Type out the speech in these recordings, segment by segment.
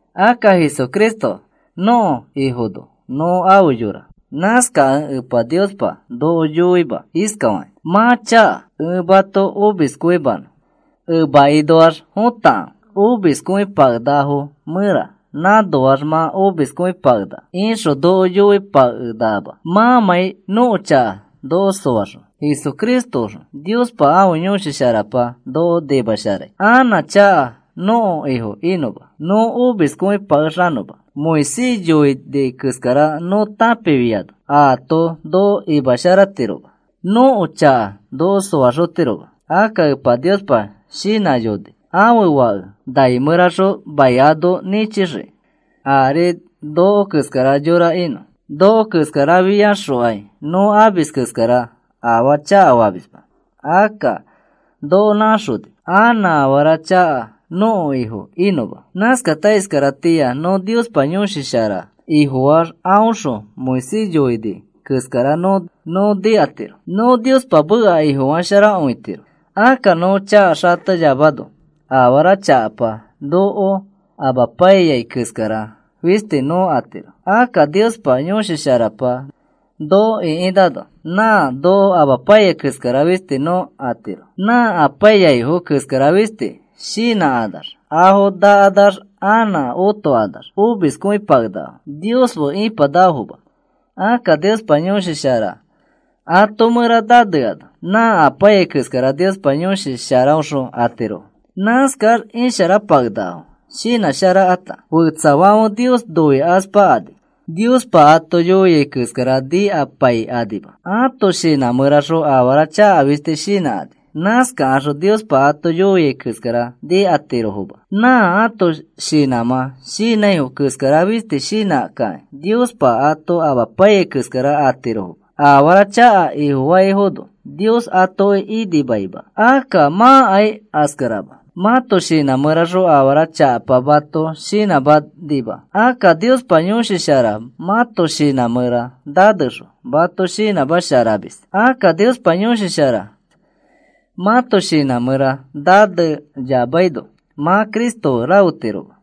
Akka Jesucristo nõko Ifono nõ afe yora. Nãskakẽ Epa Niospa noko yoima iskafakĩ: “Mã chaka. Ẽ mato omiskõimanõ. Emakinoax fotakãfe omiskõipakenakafo mẽra nãnoax mã omiskõipakenaka,” ixõ noko yoipakenakama mãmãi nõko chaka noko soaxõ, Jesucristoõxõ Niospa ãfe Yõshi Sharapa noko nimasharai anã chaka nõko ifo inõma, nõ omiskõipakexanõma. Moisés yoini keskara nõ tãpifiano aato noko imasharatiroma nõko chaka noko soaxotiroma. Akka Epa Niospa shinãyoni ãfe Fake nai mẽraxõ mai ano nĩchixiki ari noko keskara yora inõ. Noko keskarafiaxokai nõ amis keskara afaa chakafamisma. Akka noko nãxoni anã afara chaka nõko ifo inõma. Nãskata iskaratĩa nõ Niospa Yõshi Shara Ifofaax aõxõ Moisés yoini keskara nõ nikatiro. Nõ Niospa meka ifofasharakõitiro. Akka nõ chaka xateyamano afara chakapa noko amapaiyai keskara fisti nõ atiro. Akka Niospa Yõshi Sharapa noko ĩkinãno nã noko amapaiyai keskara fisti nõ atiro. Nã apaiyaifo keskara fisti shinãkanax afo nakanax anã otokanax omiskõipakenakafo. Nios fe ipanakafoma. Akka Niospa Yõshi Shara ato mẽra naneano nã apaiyai keskara Niospa Yõshi Sharaõxõ atirofo. Nãskax isharapakenakafo shinãsharakata. Fetsafãfe Nios noikaspakani Niospa ato yoia keskara nikapaikanima. Ãto shinã mẽraxõ afara chaka fisti shinãkani. Nãskaxõ Niospa ato yoia keskara nikatirofoma. Nã ãto shinãmã shinãifo keskara fisti shinãkakĩ Niospa ato amapaiyai keskara atirofoma. Afara chaka ifofaifono Nios atoki inimaima. Akka mãkai askarama. Mãto shinã mẽraxõ afara chakapa mato shinãmanima. Akka Niospa Yõshi Shara mãto shinã mẽra nanexõ mato shinãmasharamis. Akka Niospa Yõshi Shara mãto shinã mẽra naneyamaino mã Cristo fe rafetiroma.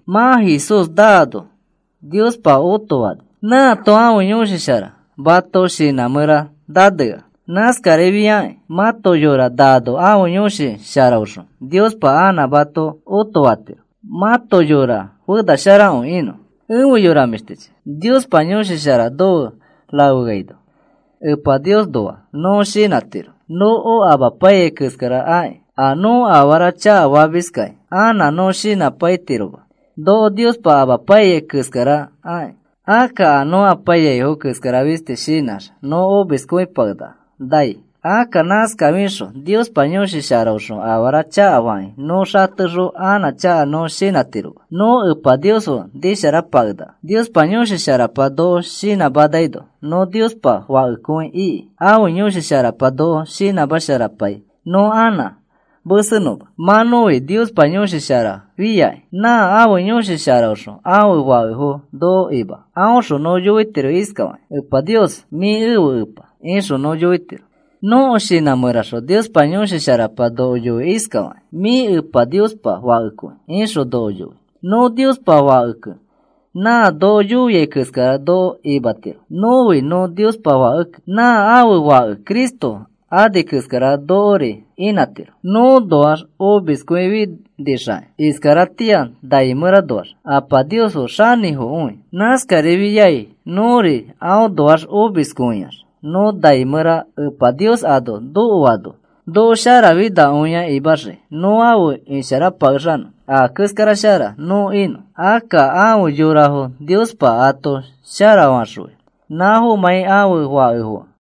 Mã Jesús naano Niospa otofani. Nãato ãfe Yõshi Shara mãto shinã mẽra nanea. Nãskarifiakĩ mãto yora naano ãfe Yõshi Sharaõxõ Niospa anã mato otofatiro mãto yora fenasharakõi inõ. Efe yora mĩshtichi, Niospa Yõshi Shara nofe rafeaino Epa Niosnoa nõ shinãtiro noko amapaiyai keskara akĩ. A nõ afara chakafamiskai anã nõ shinãpaitiroma noko Niospa amapaiyai keskara akĩ. Akka a nõ apaiyaifo keskara fisti shinãx nõ omiskõipakenaka nai. Akka nãskafixõ Niospa Yõshi Sharaõxõ afara chakafakĩ nõ xatexõ anã chaka nõ shinãtiroma. Nõ Epa Nios fe nisharapakenaka. Niospa Yõshi Sharapa noko shinãmanaino nõ Niospa fakefo iki. Ãfe Yõshi Sharapa noko shinãmasharapai nõ anã mesenõma. Mã nõfi Niospa Yõshi Shara fĩaki. Nã ãfe Yõshi Sharaõxõ ãfe fakefo noko ima. Aõxõ nõ yoitiro iskafakĩ: “Epa Nios, mĩ ẽfe Epa,” ixõ nõ yoitiro. Nõko shinã mẽraxõ Niospa Yõshi Sharapa noko yoi iskafakĩ: “Mĩ Epa Niospa Fakekõi,” ixõ noko yoi. Nõ Niospa fakekẽ nã noko yoia keskara noko inãtiro. Nõfi nõ Niospa fakekẽ nã ãfe Fake Cristo ani keskara nokori inãtiro. Nõõnoax omiskõifinixakĩ iskaratĩa nai mẽranoax Apa Nios fe xanĩfokõi. Nãskarifiai nõri aõnoax omiskõiax nõ nai mẽra Epa Nios ano nokoano noko sharafinakõia imaxii nõ afe isharapakexanõ, a keskara shara nõ inõ. Akka afe yorafo Niospa ato sharafaxõi nãfomãi ãfe fakefokẽ.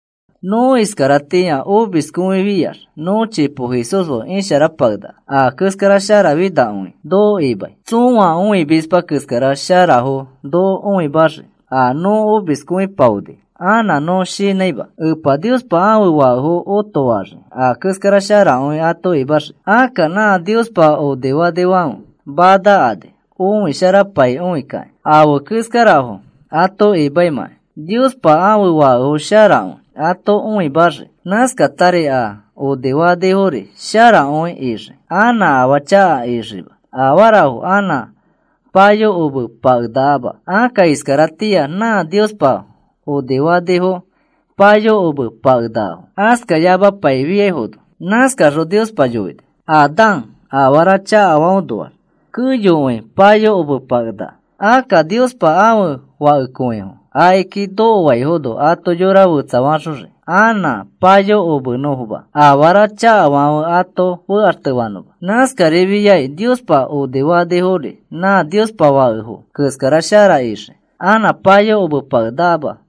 Nõ iskaratĩa omiskõiyofiax nõ chipo Jesús fe isharapakenaka. A keskara sharafinakõi noko imai. Tsõa õimisma keskara sharafo noko õimaxii. A nõ omiskõipaoni anã nõ shinãima. Epa Niospa ãfe fakefo otofaxii a keskara sharakõi ato imaxii. Akka nã Niospa onifanifãfe manakani õisharapaikõikakĩ afe keskarafo ato imaimãkai. Niospa ãfe fakefo sharakõi ato õimaxii. Nãskatari a onifanifori sharakõi ixii. Anã afaa chaka ixiima. Afarafo anã payokomepakenakama. Akka iskaratĩa nã Niospa onifanifo payokomepakenakafo askayamapaifiaifono. Nãskaxõ Niospa yoini: “Adán afara chakafaõnoax keyokõi payokomepakenaka.” Akka Niospa ãfe fakekõifo akiki nokoaifono ato yora fetsafaxoxii anã payokomenõfoma, afara chakafãfe ato fekaxtefanõma. Nãskarifiai Niospa onifanifori nã Niospa fakekõifo keskara shara ixii, anã payokomepakenakama.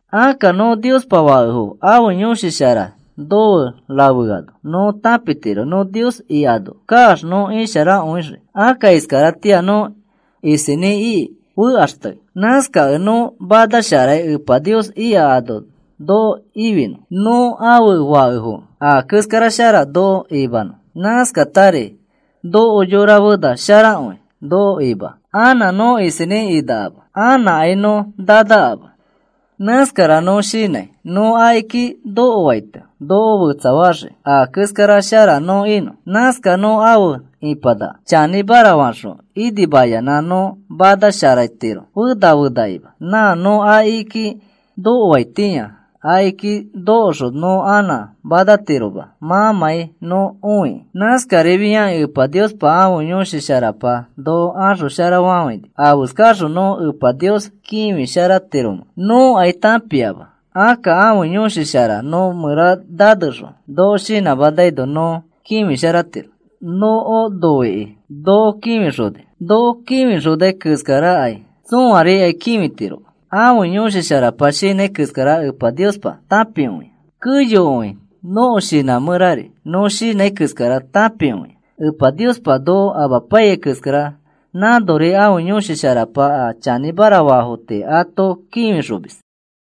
Akka nõ Niospa fakefo ãfe Yõshi Shara nofe rafeaino nõ tãpitiro nõ Nios ikano kaax nõ isharakõixii. Akka iskaratĩa nõ isinĩ iki fekaxtei. Nãskakẽ nõ manasharai Epa Nios ika ano noko ifinõ nõ ãfe fakefokẽ a keskara shara noko imanõ. Nãskatari nõko yora fena sharakõi noko imai anã nõ isinĩ inakama. Anãkai nõ nanakama. Nãskara nõ shinãi nõ akiki nokoaito noko fetsafaxii a keskara shara nõ inõ. Nãskax nõ afe ipanaka. Chanĩmara faxõ inimayanã nõ manasharatiro fena fenakima nã nõ akiki nokoaitĩa. Akiki nokoxõ nõ anã manatiroma mãmãi nõ õikĩ. Nãskarifiakĩ Epa Niospa ãfe Yõshi Sharapa noko axosharafafãini. Afeskaxõ nõ Epa Nios kĩfisharatiromẽ nõkai tãpiama. Akka ãfe Yõshi Shara nõ mẽra nanexõ noko shinãmanaino nõ kĩfisharatiro. Noko noikĩ noko kĩfixoni. Noko kĩfixonai keskarakai tsõarikai kĩfitiroma. Ãfe Yõshi Sharapa shinãi keskara Epa Niospa tãpikõia. Keyokõi nõko shinã mẽrari nõ shinãi keskara tãpikõia. Epa Niospa noko amapaiyai keskara nãnori ãfe Yõshi Sharapa a chanĩmara faafo tii ato kĩfixomis.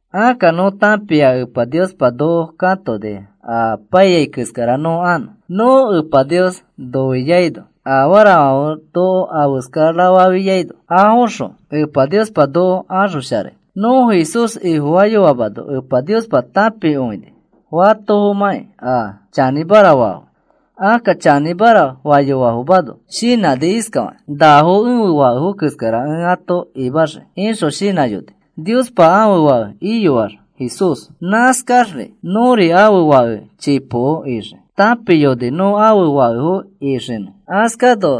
Akka nõ tãpia Epa Niospa noko katoni a apaiyai keskara nõ anõ. Nõ Epa Nios noiaino afarafãfe noko afeskarafafiaino afoxõ Epa Niospa noko axosharai. Nõ Jesús Ifofayoamano Epa Niospa tãpiyoni fatofomãkĩ a chanĩmara faifo. Akka chanĩmara fayoafomano shinãni iskafakĩ: “Nafo ẽfe Fake keskara ẽ ato imaxii,” ixõ shinãyoni. Niospa ãfe Fake iyoa Jesús. Nãskaxri nõri ãfe fake chipoko ixii. Tãpiyoni nõ ãfe fakefo ixinõ. Askano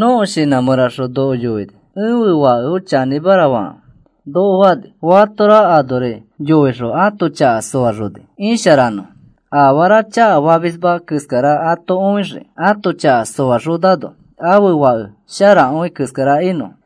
nõko shinã mẽraxõ noko yoini: “Ẽfe Fake chanĩmara fakãfe,” noko fani. Fatora anori yoixõ ato chaka soaxoni isharanõfo, afaa chakafamisma keskara ato õixii, ato chaka soaxonano ãfe Fake sharakõi keskara inõfo.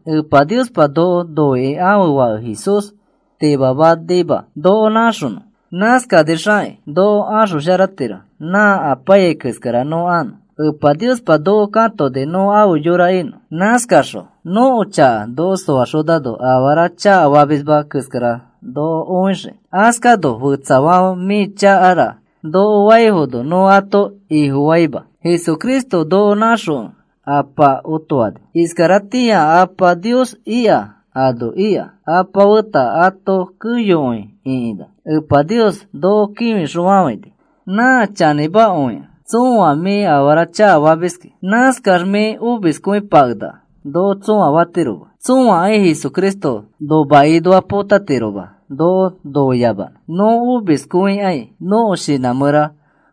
Epa Niospa noko noikĩ ãfe Fake Jesús timamanima noko naxonõ. Nãskanixakĩ noko axosharatiro nã apaiyai keskara nõ anõ. Epa Niospa noko katoni nõ afe yora inõ. Nãskaxõ nõko chaka noko soaxonano afara chakafamisma keskara noko õixiki. Askano fetsafãfe mĩ chakara noko faifono nõ ato ifofaima. Jesucristo noko nãxokẽ Ãpa otofani. Iskaratĩa Apa Nios ika ano ika Apa feta ato keyokõi ĩkinã. Epa Nios noko kĩfixõfafãini. Nã chanĩmakõikẽ tsõa, “Mĩ afara chakafamiski. Nãskax mĩ omiskõipakenaka,” noko tsõa fatiroma. Tsõakai Jesucristo nomakinoa potatiroma noko noiyamanõ. Nõ omiskõikãi, nõko shinã mẽra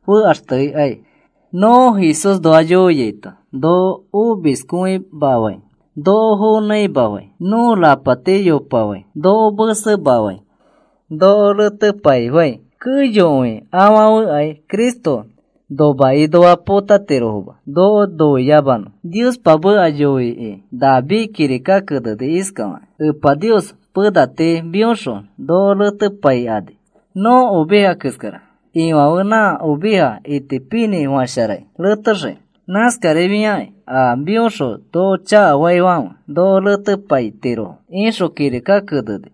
fekaxtekãi, nõ Jesúsnoa yoiaito noko omiskõimafãi, noko fonãimafãi, nõ rapati yopafãi, noko mesemafãi noko retepaifãi, keyokõi afãfekãi Cristo nomakinoa potatirofoma noko noiyamanõ. Niospa meka yoikĩ David kirika keneni iskafakĩ: Epa Nios, pena tii mĩõxõ noko retepaikani. Nõ oveja keskara. Ifãfe nã oveja itipinĩfasharai retexiki. Nãskarifiakĩ a mĩõxõ noko chakafaifãfe noko retepaitirofo, ixõ kirika keneni.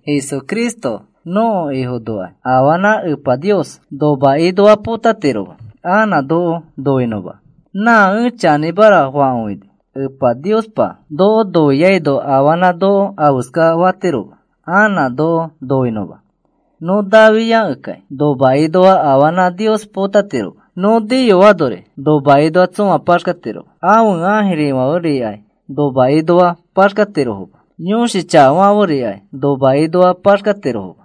Jesucristo nõko Ifonokai afanã Epa Nios nomakinoa potatiroma anã noko noinõma. Nã ẽ chanĩmara fakõini. Epa Niospa noko noiaino afanã noko afeska fatiroma anã noko noinõma. Nõ nafiakẽkai nomakinoa afanã Nios potatiroma. Nõ niyoanori nomakinoa tsõa paxkatiroma. Ãfe ãjirifãferikai nomakinoa paxkatirofoma. Yõshi chakafãferikai nomakinoa paxkatirofoma.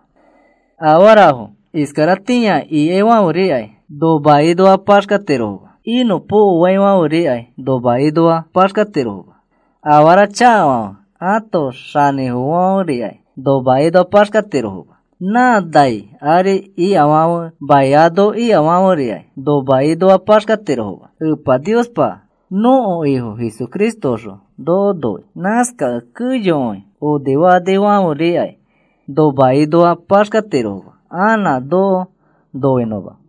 Afarafo iskaratĩa ikaifãferikai nomakinoa paxkatirofoma. Inõpokoaifãferikai nomakinoa paxkatirofoma. Afara chakafãfe ãto xãnifofofãferikai nomakinoa paxkatirofoma. Nã nai ari ikafãfe, mai ano ikafãferikai nomakinoa paxkatirofoma. Epa Niospa nõko Ifo Jesucristoxõ noko noi. Nãskakẽ keyokõi onifanifãferikai nomakinoa paxkatirofoma anã noko noinõma.